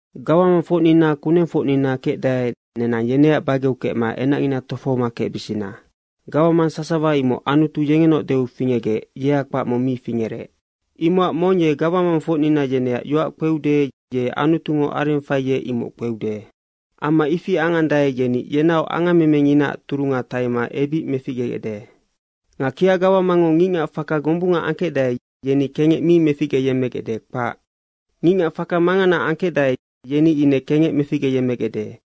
Gawamangfocnina kunengfocnina kecdae, nenang yeneac bageu kecma enacngina tofohoma kecbisina. Gawamang sasawa imoc Anutu yengenaoc deu fingecgec yea kpac mong mi fingerec. Imocac mong ye gawamangfocnina yeneac yoac kpeude, ye Anutungo areng faiec, imoc kpeude. Amma ifi angandae, yeni yenaoc angammemenginaac turunga taima ebic meficgegecde. Nga kia gawamangngo ngicngac faka gombunga angkecdae, yeni kengec mi meficgeyemmegecde, kpac. Ngicngac faka mangana angkecdae, yeni ine kengec meficgeyemmegecde.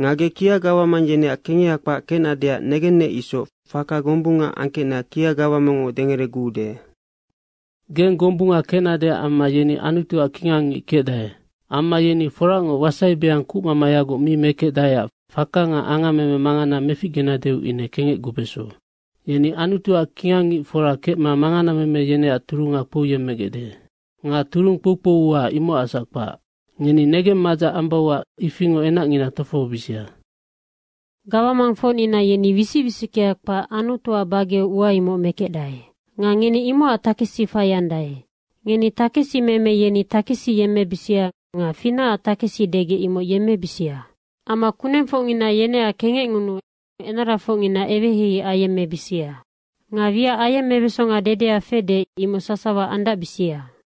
Nga ge kia gawamang yeneac kengeha kpac kecnadeac negennec isoc faka gombunga angkecna kia gawamangngo dengereguude. Geng gombunga kecnadeac amma yeni Anutuac kingangngic kecdae. Amma yeni foracngoc wasaibeang kucmamayagoc mi mekecdaeac faka nga angammeme mangana meficgenadeu ine kengecgubeso. Yeni Anutuac kingang ngicfora kecma manganameme yeneac turunga kpouyemmegecde. Nga turung kpoukpou ua, imocacsac kpac, ngeni negeng madzac ambauac ifingoc enacngina tofohobisia. Gawamangfocnina yeni wisic wisickea kpac Anutuac bageu ua imocnoc mekecdae. Nga ngeni imocacnoc takesi faiandae. Ngeni takesimeme yeni takesi yemmebisia nga finacac takesi degec imoc yemmebisia. Amma kunengfocngina yeneac kengecngunuu enarafocngina eweheihei ayemmebisia. Nga wiac ayemmebesonga dedea fede, imoc sasawa andacbisia!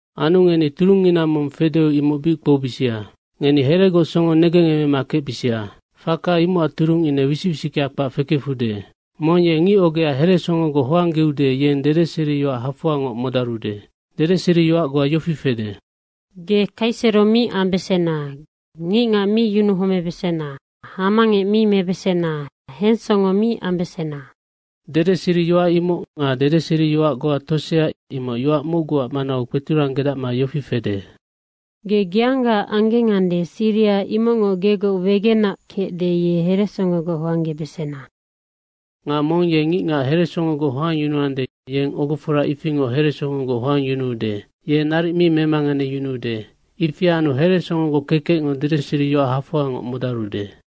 Anu ngeni turungngina mong fedeu imoc bic kpoubisia. Ngeni heregoc songo negengemema kecbisia, faka imocac turung ine wisic wisickea kpac fekefude. Mong ye ngic ogea heresongogoc hoanggeude, yeng dedeseriyoac hafoangoc modarude. Dedeseriyoac goa yofi fede, “Ge kaisero mi ambesena, ngicngac mi yunuhomebesena, hamangec mi mebesena, hensongo mi ambesena.” Dedeseriyoac imoc nga dedeseriyoac goa tosea, imoc yoac mocguac manau kpeturanggedacma yofi fede, “Ge geangga anggengande, siriha imocngoc gegoc wegena kecde, ye heresongogoc hoanggebesena.” Nga mong ye ngicngac heresongogoc hoangyunuande, yeng ogofora ifingoc heresongogoc hoangyunuude. Ye naric mi memanganeyunuude. Ifi anu heresongogoc kekecngo dedeseriyoac hafoangoc modarude.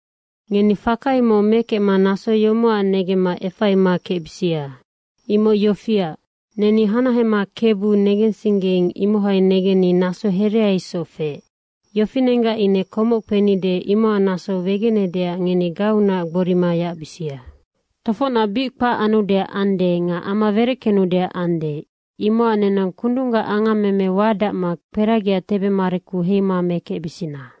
Ngeni faka imoc mekecma naso yomocac negemma efaima kecbisia! Imoc yofiac, neni hanahema Kebu negensinggeing, imohai negenni naso herea isoc feec. Yofinenggac ine komoc kpenide imocac naso wegenedeac ngeni gauunac gborima yacbisia. Tofocnac bic kpac anudeac ande nga ama wereckenudeac ande, imocac nenang kundunggac angammeme wadacma kperagiaac tebemareku heima mekecbisina.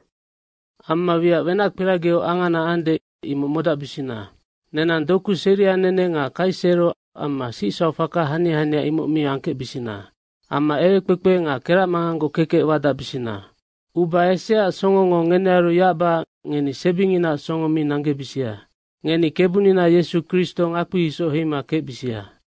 Amma wiac wenackperagiu angana ande, imoc modacbisina. Nenang doku seria nene nga kaisero amma sicsauc faka hania hania, imoc mi angkecbisina. Amma ewekpekpe nga keracmanganggoc kekec wadacbisina. Uba eseaac songongo ngenearu yacbacac ngeni sebinginaac songo mi nanggebisia. Ngeni Kebunina Yesu Kristo ngakpi isoc heima kecbisia.